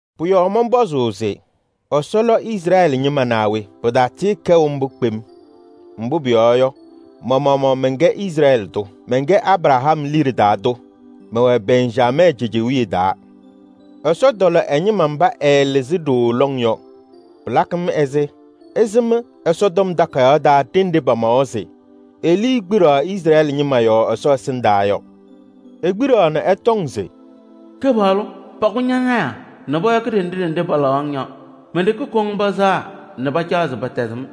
Pʋ-yɔɔ mɔnpɔzʋʋ se: Ɛsɔ lɔ Izrɛɛlɩ ñɩma naa we? Pɩtatɩɩkɛʋ mbʋ kpem! Mbʋ pʋyɔɔ yɔ, ma-maɣmaɣ mɛnkɛ Izrɛɛlɩ tʋ. Mɛnkɛ Abraham liɖe taa tʋ, mɛwɛ Bɛnjamɛɛ cejewiye taa. Ɛsɔ tɔlɔ ɛ-ñɩma mba ɛɛlɩzɩ ɖooo lɔŋ yɔ. Pɩlakɩ-m ɛzɩ ɩsɩm Ɛsɔtɔm Takayaɣ taa ɖenɖe pamawa se Elii kpiɖaɣ Izrɛɛlɩ ñɩma yɔɔ Ɛsɔ ɛsɩndaa yɔ. Ekpiɖaɣ nɛ ɛtɔŋ se: “Kɩpaɣlʋ, pakʋ ñɔ-lɔɔyɩsɩ tɩnaa nɛ pɔyɔkɩ ɖenɖe ɖenɖe palaɣ-ŋ yɔ. Men-ɖeke koŋ pɩsɛɣa nɛ pacaɣ se pɛtɛzɩ-m.”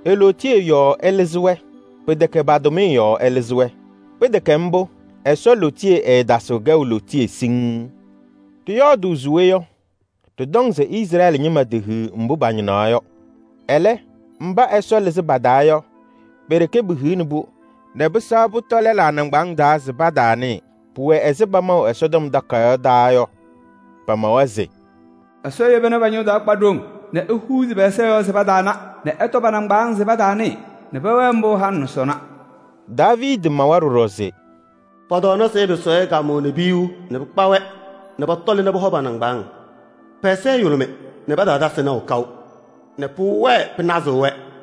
E-lootiye yɔɔ ɛlɩzɩ-wɛ, pɩtɛkɛ pa-tʋmɩyɛ yɔɔ ɛlɩzɩ-wɛ. Pɩtɛkɛ mbʋ, Ɛsɔ lootiye ɛɛtasɩɣ kɛʋ lootiye siŋŋ. Ɖɩyɔɔdʋʋ se we yɔ? Ɖɩtɔŋ se Izrɛɛlɩ ñɩma tehiɣ mbʋ pañɩnaɣ yɔ. Ɛlɛ, mba Ɛsɔ lɩzɩ pa-taa yɔ, pe-ɖeke pehiɣni-pʋ nɛ pɩsɛɣ pʋtɔ lɛlaa nɩŋgbaaŋ taa se pataanɩɩ. Pʋwɛ ɛzɩ pamaʋ Ɛsɔtɔm Takayaɣ taa yɔ. Pamawa se: “Ɛsɔ yeba nɛ pa-ñʋŋ taa kpa ɖoŋ nɛ ehuuzi pɛ-ɛza yɔɔ se pataana nɛ ɛtɔ pa-nɩŋgbaaŋ taa se pataanɩɩ nɛ pɛwɛɛ mbʋ halɩ nɛ sɔnɔ.” Daaviidi mawa ɖɔɖɔ se: “Pɔ-tɔɔnasɩ ɛpɩsɩ kaamʋʋ nɛ piyuu nɛ pɩkpa-wɛ nɛ pɔtɔlɩ nɛ pɔhɔ pa-nɩŋgbaaŋ. Pɛ-ɛza ɛyʋlʋmɩ nɛ pataana nɛ pʋwɛɛ pɩnazɩɣ-wɛ.”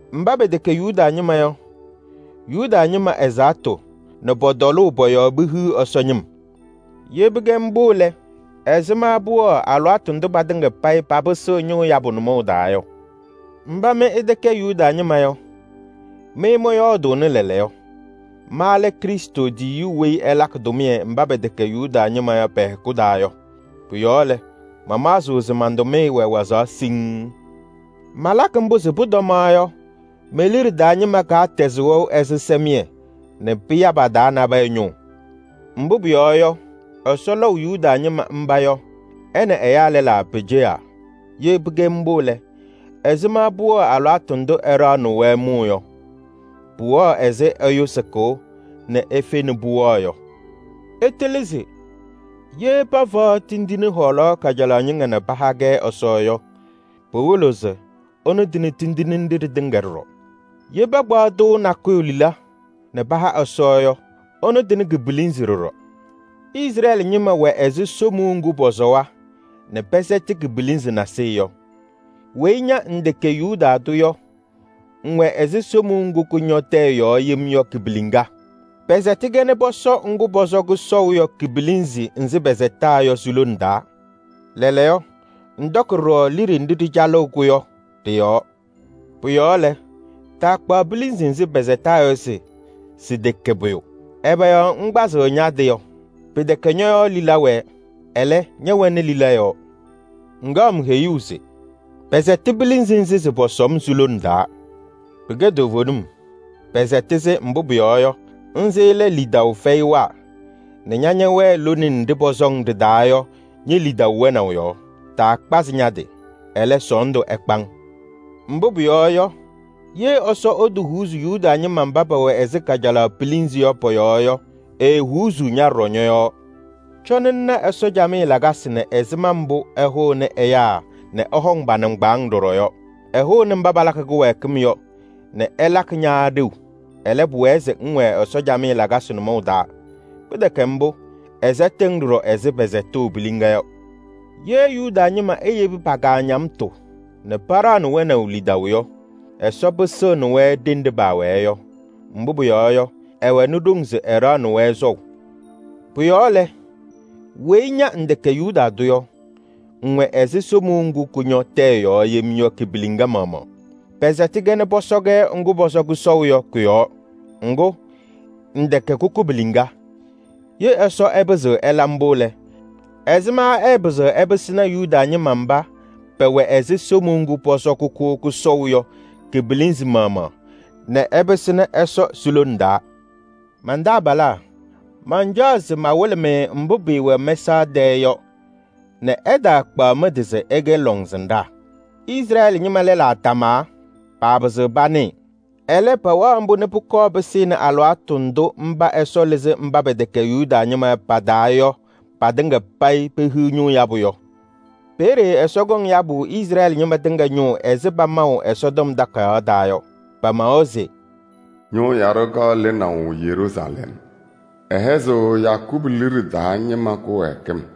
Mba pɛtɛkɛ Yuda ñɩma yɔ, Yuda ñɩma ɛzaɣtʋ nɛ pɔ-tɔlʋʋ pɔ-yɔɔ pehiɣ Ɛsɔ ñɩm. Ye pɩkɛ mbʋ lɛ, ɛzɩma pʋwɛɣ alɩwaatʋ ndʋ patɩŋa payɩ papɩsɩɣ ñʋʋ yabʋ nʋmɔʋ taa yɔ? Mba mɩ ɩtɛkɛ Yuda ñɩma yɔ, mɩ mɔyɔɔdʋʋnɩ lɛɛlɛɛyɔ: ma lɛ Krɩstʋ tiyiyu weyi ɛlakɩ tʋmɩyɛ mba pɛtɛkɛ Yuda ñɩma yɔ pɛ-hɛkʋ taa yɔ. Pʋ-yɔɔ lɛ, mamaɣzɩɣ se man-tʋmɩyɛ wɛ wazaɣ siŋŋ. Malakɩ mbʋ se pʋtɔmaɣ yɔ, me-liɖe taa ñɩma tɛzɩ wɛʋ ɛzɩsɛmɩyɛ nɛ pɩya pa-taa nabɛyɛ ñʋʋ. Mbʋ pʋyɔɔ yɔ, Ɛsɔ lɔʋ Yuda ñɩma mba yɔ ɛ nɛ ɛyaa lɛlaa peceɣaa. Ye pɩkɛ mbʋ lɛ, ɛzɩma pʋwɛɣ alɩwaatʋ ndʋ ɛɖaɣnɩɣ-wɛ mʋʋ yɔ? Pʋwɛɣ ɛzɩ ɛyʋ sɩkʋʋ nɛ efe nɛ pʋwɛɣ yɔ. Ɩtɩlɩ se: ye pafaɣ tindine hɔɔlaɣ kajalaɣ ñɩŋga nɛ paha-kɛ Ɛsɔ yɔ, pɩwɩlɩɣ se ɛnʋ tɩnɩ tindine nɖɩ ɖɩtɩŋa ɖɔɖɔ. Ye pakpaɣ tɩʋ nakʋyʋ lila nɛ paha Ɛsɔ yɔ, ɛnʋ tɩnɩ ki-pilinzi ɖɔɖɔ. Izrɛɛlɩ ñɩma wɛ ɛzɩ somuu ŋgʋ pɔsɔwa nɛ pɛsɛtɩ ki-pilinzi nasɩyɩ yɔ. Weyi ña ŋtɛkɛ Yuda tʋ yɔ, ŋwɛ ɛzɩ somuu ŋgʋ kʋñɔ tɛyɛ yem yɔ ki-piliŋa. Pɛsɛtɩ-kɛ nɛ pɔsɔ ŋgʋ pɔsɔ kʋsɔʋ yɔ ki-pilinzi nzɩ pɛsɛtaa yɔ si-lone taa: lɛɛlɛɛyɔ, ŋwaɣ ɖɔɖɔ liɖe nɖɩ ɖɩcalɩɣ-kʋ yɔ ɖɩ-yɔɔ. Pʋ-yɔɔ lɛ, taakpaɣ pilinzi nzɩ pɛsɛtaa yɔ se sɩtɛkɛ pʋyʋ. Ɛbɛ yɔɔ ŋkpazɩɣ ña-tɩ yɔ? Pɩtɛkɛ ñɔ-yɔɔ lila wɛɛ, ɛlɛ, ñɛwɛnɩ lila yɔɔ. Ŋkaɣ-m heyuu se “Pɛsɛtɩ pilinzi nzɩ se pɔsɔ-m si-lone taa.” Pɩkɛ toovenim. Pɛsɛtɩ-sɩ, mbʋ pʋyɔɔ yɔ, nzɩ lɛ lidaʋ fɛyɩwaa nɛ ña ñɛwɛɛ lone nɖɩ pɔsɔ-ŋ ɖɩ-taa yɔ ñe-lidaʋ wɛnaʋ yɔɔ. Taakpazɩ ña-tɩ, ɛlɛ, sɔɔndʋ ɛkpa-ŋ. Mbʋ pʋyɔɔ yɔ, ye Ɛsɔ ɛtɛfɛɛ Yuda ñɩma mba pɛwɛ ɛzɩ kajalaɣ pilinzi yɔ yɔ, ɛɛfɛɣ ña ɖɔɖɔ. Cɔnɩ ŋna Ɛsɔ camɩyɛ lakasɩ nɛ ɛzɩma mbʋ ɛhʋʋnɩ ɛyaa nɛ ɛhɔŋ pa-nɩŋgbaaŋ ɖɔɖɔ yɔ: ɛhʋʋnɩ mba palabɩ kɩwɛɛkɩm yɔ nɛ ɛlakɩ ña ɖeu. Ɛlɛ, pʋwɛɛ se ŋwɛɛ Ɛsɔ camɩyɛ lakasɩ nʋmɔʋ taa. Pɩtɛkɛ mbʋ, ɛsɛtɩɣ-ŋ ɖɔɖɔ ɛzɩ pɛsɛtʋʋ piliŋa yɔ. Ye Yuda ñɩma eyebi pa-kaañamtʋ nɛ paɖaɣnɩ wɛnaʋ lidaʋ yɔ, Ɛsɔ pɩsɩɣnɩ-wɛ ɖenɖe paawɛɛ yɔ. Mbʋ pʋyɔɔ yɔ, ɛwɛnɩ ɖoŋ se ɛɖaɣnɩ-wɛ sɔʋ. Pʋ-yɔɔ lɛ, weyi ña ŋtɛkɛ Yuda tʋ yɔ, ŋwɛ ɛzɩ somuu ŋgʋ kʋñɔ tɛyɛ yem yɔ ki-piliŋa maɣmaɣ: pɛsɛtɩ-kɛ nɛ pɔsɔ-kɛ ŋgʋ pɔsɔ kʋsɔʋ yɔ kʋ-yɔɔ. Ŋgʋ, ŋtɛkɛ kʋkʋ piliŋa. Ye Ɛsɔ ɛpɩzɩɣ ɛla mbʋ lɛ, ɛzɩma ɛɛpɩzɩɣ ɛpɩsɩnɩ Yuda ñɩma mba pɛwɛ ɛzɩ somuu ŋgʋ pɔsɔ kʋkʋ kʋsɔʋ yɔ ki-pilinzi maɣmaɣ nɛ ɛpɩsɩnɩ ɛsɔ si-lona taa? Man-taabalaa, mancaɣ se mawɩlɩ-mɩ mbʋ pɩɩwɛ mɛsaɣ tɛɛ yɔ nɛ ɩtaakpaɣ mɩ-tɩ se ɩkɛ lɔŋsɩnɖaa: Izrɛɛlɩ ñɩma lɛlaa tamaa, paapɩzɩɣ panɩɩ. Ɛlɛ, pɛwɛɣ mbʋ nɛ pʋkɔɔ pɩsɩnɩ alɩwaatʋ ndʋ mba Ɛsɔ lɩzɩ mba pɛtɛkɛ Yuda ñɩma yɔ pa-taa yɔ patɩŋa payɩ pehiɣ ñʋʋ yabʋ yɔ. Peeye Ɛsɔ kɔŋ yabʋ Izrɛɛlɩ ñɩma tɩŋa ñʋʋ ɛzɩ pamaʋ Ɛsɔtɔm Takayaɣ taa yɔ. Pamawa se: “Ñʋʋ yaɖʋ kaɣ lɩnaʋ Siiyɔɔ, ɛlakɩ nɛ Yakɔɔbʋ liɖe taa ñɩma yele pa-kaañamtʋ.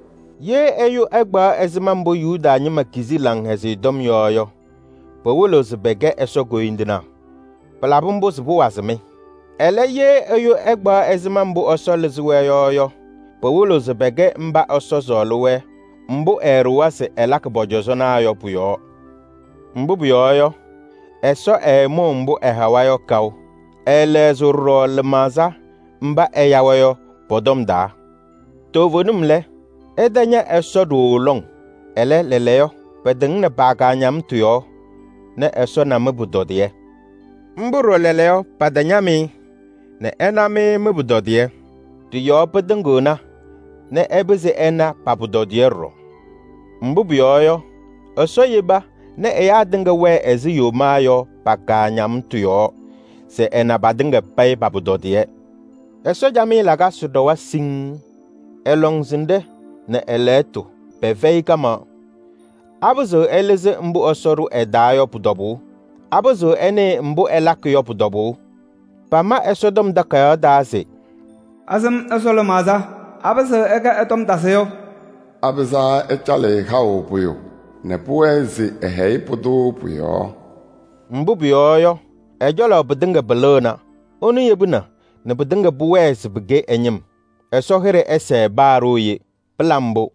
Ye ɛyʋ ɛkpaɣ ɛzɩma mbʋ Yuda ñɩma kizi Laŋhɛzɩyɛ Tɔm yɔ yɔ, pɩwɩlɩɣ se pɛkɛ Ɛsɔ koyindinaa. Pɩlabɩ mbʋ se pʋwazɩ-mɩ. Ɛlɛ, ye ɛyʋ ɛkpaɣ ɛzɩma mbʋ Ɛsɔ lɩzɩ-wɛ yɔ yɔ, pɩwɩlɩɣ se pɛkɛ mba Ɛsɔ sɔɔlɩ-wɛ mbʋ ɛɛɖʋwa se ɛlakɩ pɔ-cɔzɔnaa yɔ pʋ-yɔɔ. Mbʋ pʋyɔɔ yɔ, Ɛsɔ ɛɛmʋʋ mbʋ ɛhawa yɔ kaʋ. Ɛɛlɛɣzɩɣ ɖɔɖɔ lɩmaɣza mba ɛya-wɛ yɔ pɔ-tɔm taa. Toovenim lɛ, ɩtaña Ɛsɔ ɖooo lɔŋ. Ɛlɛ, lɛɛlɛɛyɔ pɩtɩŋnɩ pa-kaañamtʋ yɔɔ nɛ Ɛsɔ na mɩ-pʋtɔdɩyɛ. Mbʋ ɖɔɖɔ lɛɛlɛɛyɔ patañam-ɩ nɛ ɛna mɩ mɩ-pʋtɔdɩyɛ. Ɖɩ-yɔɔ pɩtɩŋɩɣna nɛ ɛpɩzɩ ɛna pa-pʋtɔdɩyɛ ɖɔɖɔ. Mbʋ pʋyɔɔ yɔ, Ɛsɔ yeba nɛ ɛyaa tɩŋa wɛɛ ɛzɩ yomaa yɔ pa-kaañamtʋ yɔɔ se ɛna patɩŋa payɩ pa-pʋtɔdɩyɛ. Ɛsɔ camɩyɛ lakasɩ ɖɔwa siŋŋ! Ɛ-lɔŋsɩnɖɛ nɛ ɛ-lɛɣtʋ pɛfɛyɩ kamaɣ! Apɩzɩɣ ɛlɩzɩ mbʋ Ɛsɔ ɖʋ ɛ-taa yɔ pʋ-tɔbʋʋ? Apɩzɩɣ ɛnɩɩ mbʋ ɛlakɩ yɔ pʋ-tɔbʋʋ? Pama Ɛsɔtɔm Takayaɣ taa se: “Asɩm Ɛsɔ lɩmaɣza? Apɩzɩɣ ɛkɛ ɛ-tɔm tasɩyʋ? Apɩzaa ɛcalɩ-ɩ haʋ pʋyʋ nɛ pʋwɛɛ se ɛhɛyɩ pʋdʋ pʋ-yɔɔ?” Mbʋ pʋyɔɔ yɔ, ɛ-cɔlɔ pɩtɩŋa pɩlɩɣna. Ɛnʋ yebina pɩtɩŋa pʋwɛɛ se pɩkɛ ɛ-ñɩm. Ɛsɔ hɩɖɛ ɛsɛɛ paa ɖooye! Pɩla mbʋ!